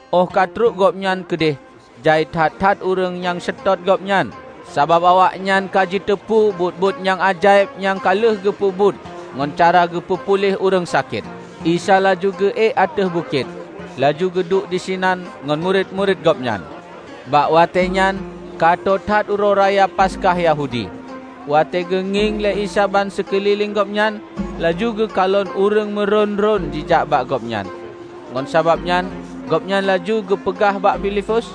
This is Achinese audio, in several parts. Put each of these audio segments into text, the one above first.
Óh ka trok gobnyan keudeh, jai that-that ureuëng nyang seutôt Gobnyan sabab awaknyan ka jiteupeue buet-buet nyang ajaéb nyang ka lheueh geupeubuet ngon cara geupeu puléh ureuëng sakét. Isa laju geuék u ateueh bukét, laju geuduek disinan ngon murit-murit Gobnyan. Bak watée nyan ka tô that Uroe Raya Paskah Yahudi. Watée geungieng lé Isa ban sikeulileng Gobnyan, laju geukalon ureuëng meurôn-rôn jijak bak Gobnyan. Ngon sabab nyan Gobnyan laju geupeugah bak Filipus,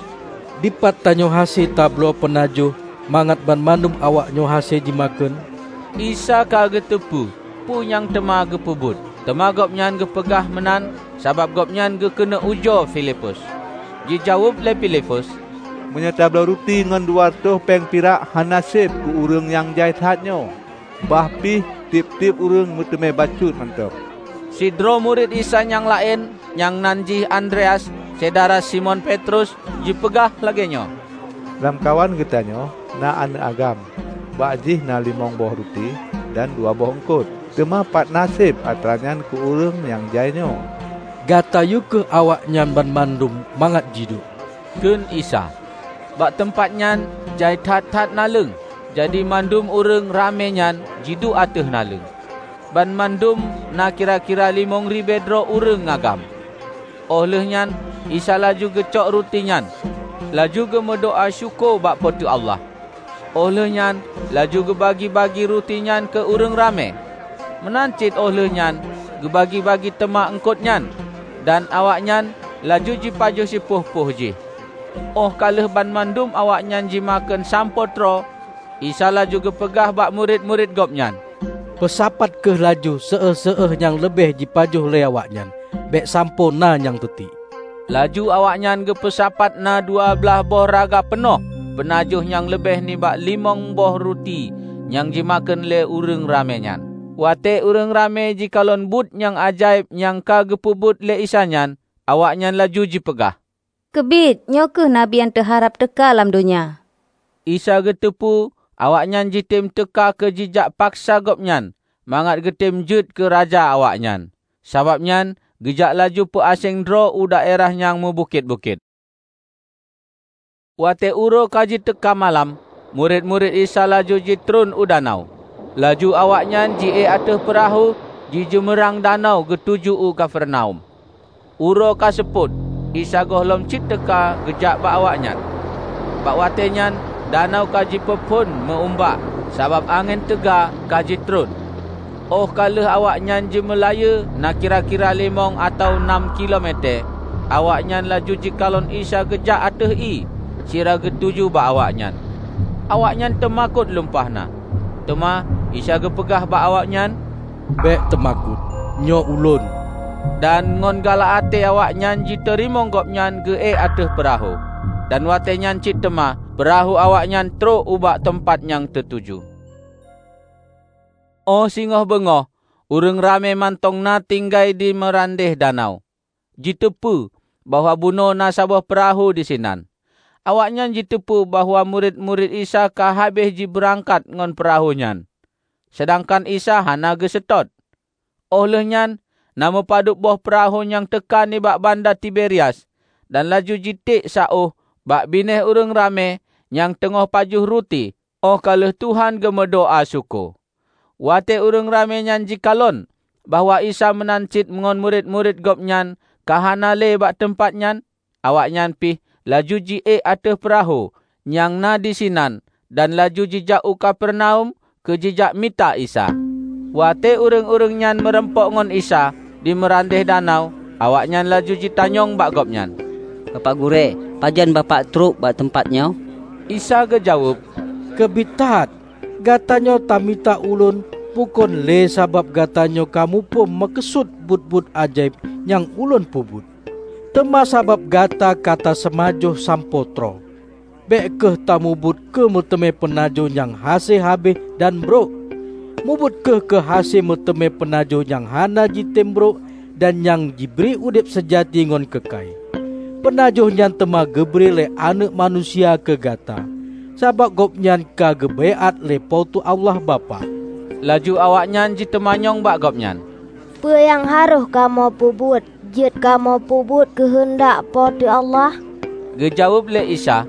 "Dipat tanyoe hase tabloe peunajoh mangat banmandum awaknyoe hase jimakheun?" ( Isa ka geuteupeue peue nyang teuma geupeubuet, teuma Gobnyan geupeugah meunan sabab Gobnyan geukeuneuk ujoe Filipus.) Jijaweueb lé Filipus, "Meunyoe tabloe ruti ngon dua reutôh péng pirak hana seb keu ureuëng nyang jai that nyoe, bah pih tieb-tieb ureuëng meuteumé bacut mantong." Sidroe murit Isa nyang laén, nyang nan jih Andreas, syedara Simon Petrus, jipeugah lagée nyoe, "Lamkawan geutanyoe na aneuëk agam bak jih na limong boh ruti dan dua boh eungkot. Teuma patna seb atranyan keu ureuëng nyang jai nyoe?" "Gata yue kheueh awaknyan banmandum mangat jiduek," kheun Isa. Bak teumpat nyan jai that-that naleueng, jadi mandum ureuëng ramé nyan jiduek ateueh naleueng -- banmandum na kira-kira limong ribée droe ureuëng agam. Óh lheueh nyan Isa laju geucok ruti nyan, laju geu-meudoá syukoe bak Po teu Allah. Óh lheueh nyan laju geubagi-bagi ruti nyan keu ureuëng ramé. Meunan cit óh lheuehnyan geubagi-bagi teuma eungkot nyan, dan awaknyan laju jipajoh sipuih-puih jih. Óh ka lheueh banmandum awaknyan jimakheun sampoe troe, Isa laju geupeugah bak murit-murit Gobnyan, "Peusapat kheueh laju séueh-séueh nyang leubeh jipajoh lé awaknyan; bék sampoe na nyang teutiek." Laju awaknyan geupeusapat na dua blaih boh raga peunoh peunajoh nyang leubeh nibak limong boh ruti nyang jimakheun lé ureuëng ramé nyan. Watée ureuëng ramé jikalon buet nyang ajaéb nyang ka geupeubuet lé Isa nyan, awaknyan laju jipeugah, "Keubiet, nyoe kheueh Nabi nyang teuharab teuka lam donya!" Isa geuteupeue awaknyan jitem teuka keu jijak paksa Gobnyan mangat geutem jeuet keu raja awaknyan. Sabab nyan geujak laju peuaséng droe u daerah nyang meubukét-bukét. Watée uroe ka jiteuka malam, murit-murit Isa laju jitron u danau. Laju awaknyan jiék ateueh peurahô jijeumeurang danau geutuju u Kapernaum. Uroe ka seupôt Isa gohlom cit teuka geujak bak awaknyan. Bak watée nyan danau ka jipeuphon meu-umbak sabab angén teuga ka jitreun. Óh ka lheueh awaknyan jimeulayeue na kira-kira limong atawa nam kilo metée, awaknyan laju jikalon Isa geujak ateueh ié sira geutuju bak awaknyan. Awaknyan teumakot lumpah na. Teuma Isa geupeugah bak awaknyan, "Bék teumakot, nyoe Ulôn!" Dan ngon galak até awaknyan jiteurimong Gobnyan geuék ateueh peurahô, dan watée nyan cit teuma peurahô awaknyan trok ubak teumpat nyang teutuju. Óh singoh beungoh ureuëng ramé mantong na tinggai di meurandeh danau, jiteupeue bahwa bunoe na saboh peurahô disinan. Awaknyan jiteupeue bahwa murit-murit Isa ka habéh jibeurangkat ngon peurahô nyan, seudangkan Isa hana geuseutôt. Óh lheuehnyan na meupadub boh peurahô nyang teuka nibak banda Tiberias dan laju jitiek saôh bak binéh ureuëng ramé nyang teungoh pajoh ruti óh ka lheueh Tuhan geumeudoá syukoe. Watée ureuëng ramé nyan jikalon bahwa Isa meunan cit ngon murit-murit Gobnyan ka hana le bak teumpat nyan, awaknyan pih laju jiék ateueh peurahô nyang na disinan dan laju jijak u Kapernaum keu jijak mita Isa. Watée ureuëng-ureuëng nyan meurumpok ngon Isa di meurandeh danau, awaknyan laju jitanyong bak Gobnyan, "Bapak Gurée, pajan Bapak trok bak teumpat nyoe?" Isa geujaweueb, "Keubiet that, gatanyoe ta mita Ulôn bukon lé sabab gatanyoe ka muphom meukeusut buet-buet ajaéb nyang Ulôn peubuet, teuma sabab gata ka taseumajoh sampoe troe. Bék kheueh tamubuet keu meuteumé peunajoh nyang hase habéh dan brok. Mubuet kheueh keu hase meuteumé peunajoh nyang hana jitem brok dan nyang jibri udeb seujati ngon keukai. Peunajoh nyan teuma geubri lé Aneuëk Manusia keu gata, sabab Gobnyan ka geubaiát lé Po teu Allah Bapak." Laju awaknyan jiteumanyong bak Gobnyan, "Peue nyang harôh kamoe peubuet jeuet kamoe peubuet keuheundak Po teu Allah?" Geujaweueb lé Isa,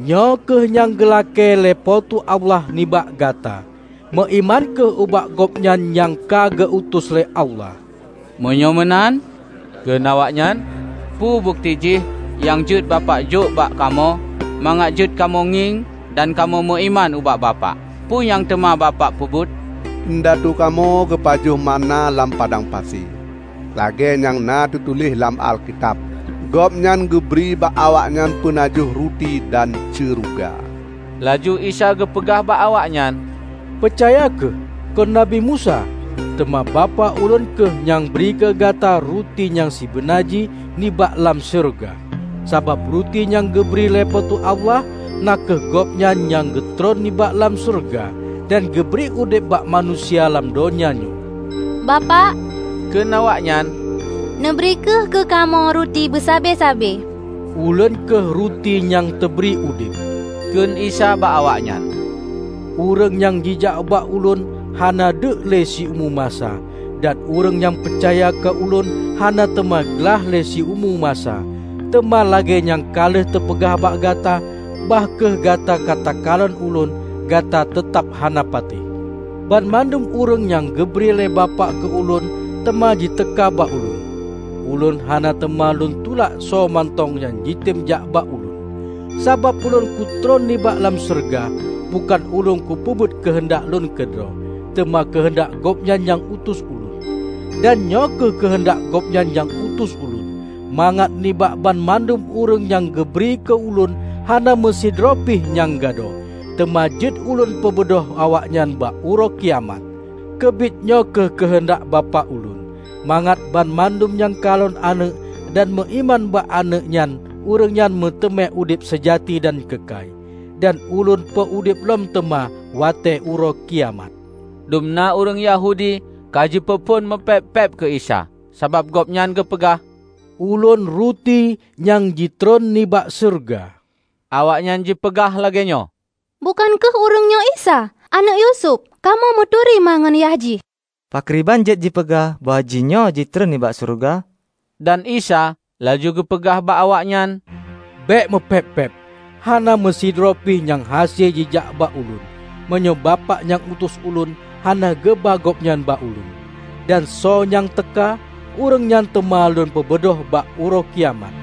"Nyoe kheueh nyang geulakée lé Po teu Allah nibak gata: Meuiman kheueh ubak Gobnyan nyang ka geu-utus lé Allah." "Meunyoe meunan," kheun awaknyan, "Peue bukeuti jih nyang jeuet bapak jok bak kamoe mangat jeuet kamoe ngieng dan kamoe meuiman ubak Bapak? Peue nyang teuma Bapak peubuet? Indatu kamoe geupajoh manna lam padang pasi, lagée nyang na teutuléh lam Alkitab, 'Gobnyan geubri bak awaknyan peunajoh ruti dan syeuruga.' " Laju Isa geupeugah bak awaknyan, "Peucaya kheueh: Kon Nabi Musa, teuma Bapak Ulôn kheueh nyang bri keu gata ruti nyang sibeuna jih nibak lam syeuruga. Sabab ruti nyang geubri lé Po teu Allah na kheueh Gobnyan nyang geutreun nibak lam syeuruga, dan geubri udeb bak manusia lam donya nyoe." "Bapak," kheun awaknyan, "Neubri kheueh keu kamoe ruti beusabe-sabe," "Ulôn kheueh ruti nyang teubri udeb," kheun Isa bak awaknyan. "Ureuëng nyang jijak bak Ulôn hana deuek le siumu masa. Dan ureuëng nyang peucaya keu Ulôn hana teuma glaih le siumu masa." "Teuma lagée nyang ka lheueh teupeugah bak gata, bah kheueh gata ka takalon ulôn, gata teutab hana patéh. Banmandum ureuëng nyang geubri lé Bapak keu Ulôn teuma ji teuka bak Ulôn. Ulôn hana teuma lôn tulak soemantong nyang jitem jak bak Ulôn. Sabab Ulôn kutreun nibak lam syeuruga, bukon Ulôn kupeubuet keuheundak Lôn keudroe, teuma keuheundak Gobnyan nyang utus Ulôn. Dan nyoe kheueh keuheundak Gobnyan nyang utus Ulôn: mangat nibak banmandum ureuëng nyang geubri keu Ulôn, hana meusidroe pih nyang gadôh; teuma jeuet Ulôn peubeudôh awaknyan bak Uroe Kiamat. Keubiet nyoe kheueh keuheundak Bapak Ulôn: Mangat banmandum nyang kalon Aneuëk dan meuiman bak Aneuëk nyan ureuëng nyan meuteumé udeb seujati dan keukai, dan Ulôn peu-udeb lom teuma watée Uroe Kiamat." Dum na ureuëng Yahudi ka jipeuphon meupéb-péb keu Isa, sabab Gobnyan geupeugah: "Ulôn ruti nyang jitreun nibak syeuruga", Awaknyan jipeugah lagée nyoe, "Bukon kheueh ureuëng nyoe Isa, aneuëk Yusuf? Kamoe meuturi ma ngon yah jih! Pakriban jeuet jipeugah bahwa jihnyoe jitreun nibak Syeuruga?" Dan Isa laju geupeugah bak awaknyan, "Bék meupéb-péb. Hana meusidroe pih nyang hase jijak bak Ulôn, meunyoe Bapak nyang utus Ulôn, hana geuba gobnyan bak Ulôn; dan soe nyang teuka, ureuëng nyan teuma lôn peubeudôh bak Uroe Kiamat.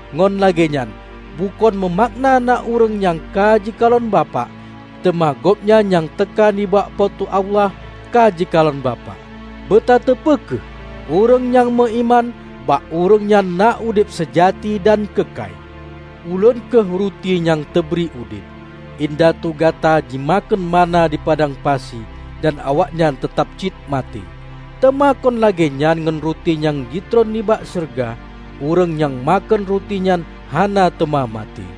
Ngon lagée nyan bukon meumakna na ureuëng nyang ka jikalon Bapak. Teuma gobnyan nyang teuka nibak Po teu Allah, ka jikalon Bapak. Beutateupeue kheueh: Ureuëng nyang meuiman, bak ureuëng nyan na udeb seujati dan keukai. Ulôn kheueh ruti nyang teubri udeb. Indatu gata jimakheun manna di padang pasi dan awaknyan teutab cit maté. Teuma kon lagée nyan ngon ruti nyang jitron nibak syeuruga; ureuëng nyang makheun ruti nyan hana teuma maté.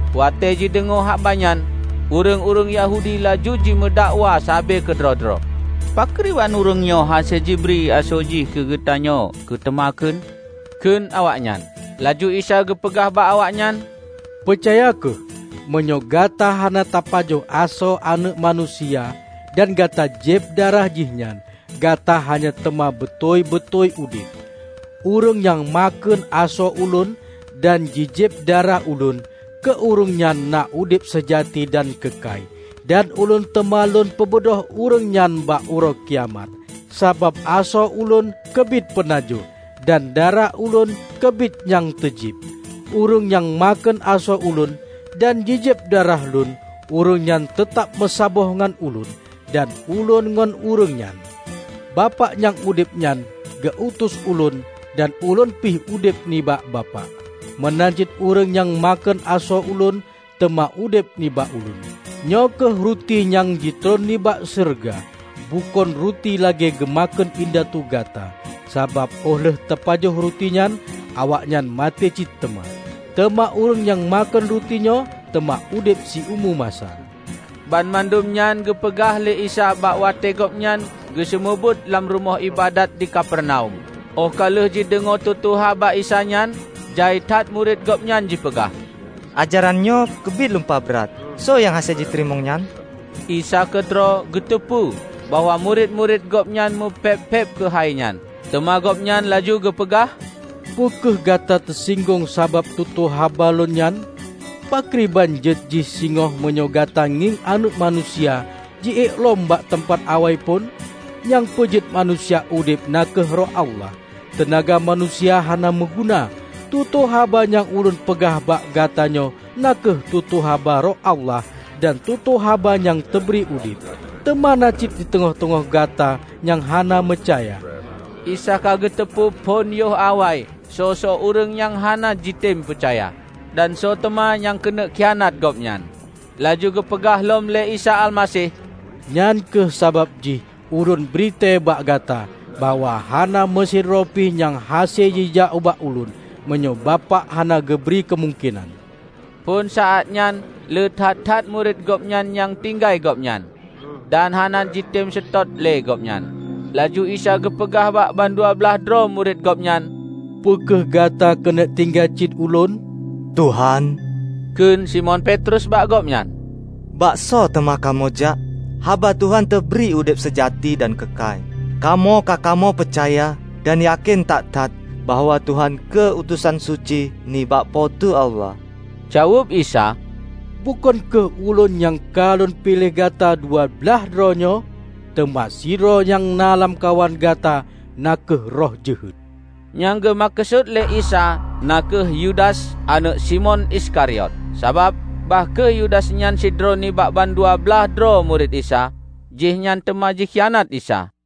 Watée jideungoe haba nyan ureuëng-ureuëng Yahudi laju jimeudakwa sabe keudroe-droe, "Pakriban ureuëng nyoe hase jibri asoe Jih keu geutanyoe keu teumakheun?" kheun awaknyan. Laju Isa geupeugah bak awaknyan, "Peucaya kheueh: Meunyoe gata hana tapajoh asoe Aneuëk Manusia dan gata jieb darah Jihnyan, gata hana teuma beutôi-beutôi udeb. Ureuëng nyang makheun asoe Ulôn dan jijieb darah Ulôn keu ureuëng nyan na udeb seujati dan keukai dan Ulôn teuma Lôn peubeudôh ureuëng nyan bak Uroe Kiamat. Sabab asoe Ulôn keubiet peunajoh, dan darah Ulôn keubiet nyang teujieb. Ureuëng nyang makheun asoe Ulôn dan jijieb darah Lôn, ureuëng nyan teutab meusaboh ngon Ulôn, dan Ulôn ngon ureuëng nyan. Bapak nyang udeb nyan, geu-utus Ulôn dan Ulôn pih udeb nibak Bapak. Meunan cit ureuëng nyang makheun asoe Ulôn teuma udeb nibak Ulôn. Nyoe kheueh ruti nyang jitreun nibak syeuruga: bukon ruti lagée geumakheun indatu gata. Sabab óh lheueh teupajoh rutinyan, awaknyan maté cit teuma. Teuma ureuëng nyang makheun ruti nyoe teuma udeb siumu masa." Banmandum nyan geupeugah lé Isa bak watée Gobnyan geuseumeubeuet lam rumoh iébadat di Kapernaum. Óh ka lheueh jideungoe tutoe gaba Isa nyan, jai that murit Gobnyan jipeugah, "Ajarannyoe keubiet lumpah brat. Soe nyang hase jiteurimong nyan!" Isa keudroe geuteupeue bahwa murit-murit Gobnyan meupéb-péb keuhai nyan. Teuma Gobnyan laju geupeugah, "Peu kheueh gata teusinggong sabab tutoe haba lôn nyan? Pakriban jeuet jih singoh meunyoe gata ngieng Aneuëk Manusia jiék lom bak teumpat awai phon? Nyang peujeuet manusia udeb na kheueh Roh Allah. Teunaga manusia hana meuguna. Tutoe haba nyang Ulôn peugah bak gata nyoe na kheueh tutoe haba Roh Allah dan tutoe haba nyang teubri udeb. Teuma na cit diteungoh-teungoh gata nyang hana meucaya." (Isa ka geuteupeue phon yoh awai soe-soe ureuëng nyang hana jitem peucaya, dan soe teuma nyang keuneuk khianat Gobnyan.) Laju geupeugah lom lé Isa Almaseh, "Nyan kheueh sabab jih Ulôn britée bak gata bahwa hana meusidroe pih nyang hase jijak bak Ulôn, meunyoe Bapak hana geubri keumungkenan." Phon saát nyan le that that murit Gobnyan nyang tinggai Gobnyan, dan hana jitem seutôt le Gobnyan. Laju Isa geupeugah bak bandua blaih droe murit Gobnyan, "Peu kheueh gata keuneuk tinggai cit Ulôn?" "Tuhan," kheun Simon Petrus bak Gobnyan, "Bak soe teuma kamoe jak? Haba Tuhan teubri udeb seujati dan keukai. Kamoe ka kamoe peucaya dan yakén that-that bahwa Tuhan kheueh utosan suci nibak Po teu Allah." Jaweueb Isa, "Bukon kheueh Ulôn nyang ka Lôn piléh gata dua blaih droe nyoe? Teuma sidroe nyang na lamkawan gata na kheueh roh jeuhet!" Nyang geumeukeusut lé Isa na kheueh Yudas aneuëk Simon Iskariot. Sabab, bah kheueh Yudas nyan sidroe nibak bandua blaih droe murit Isa, jihnyan teuma jikhianat Isa.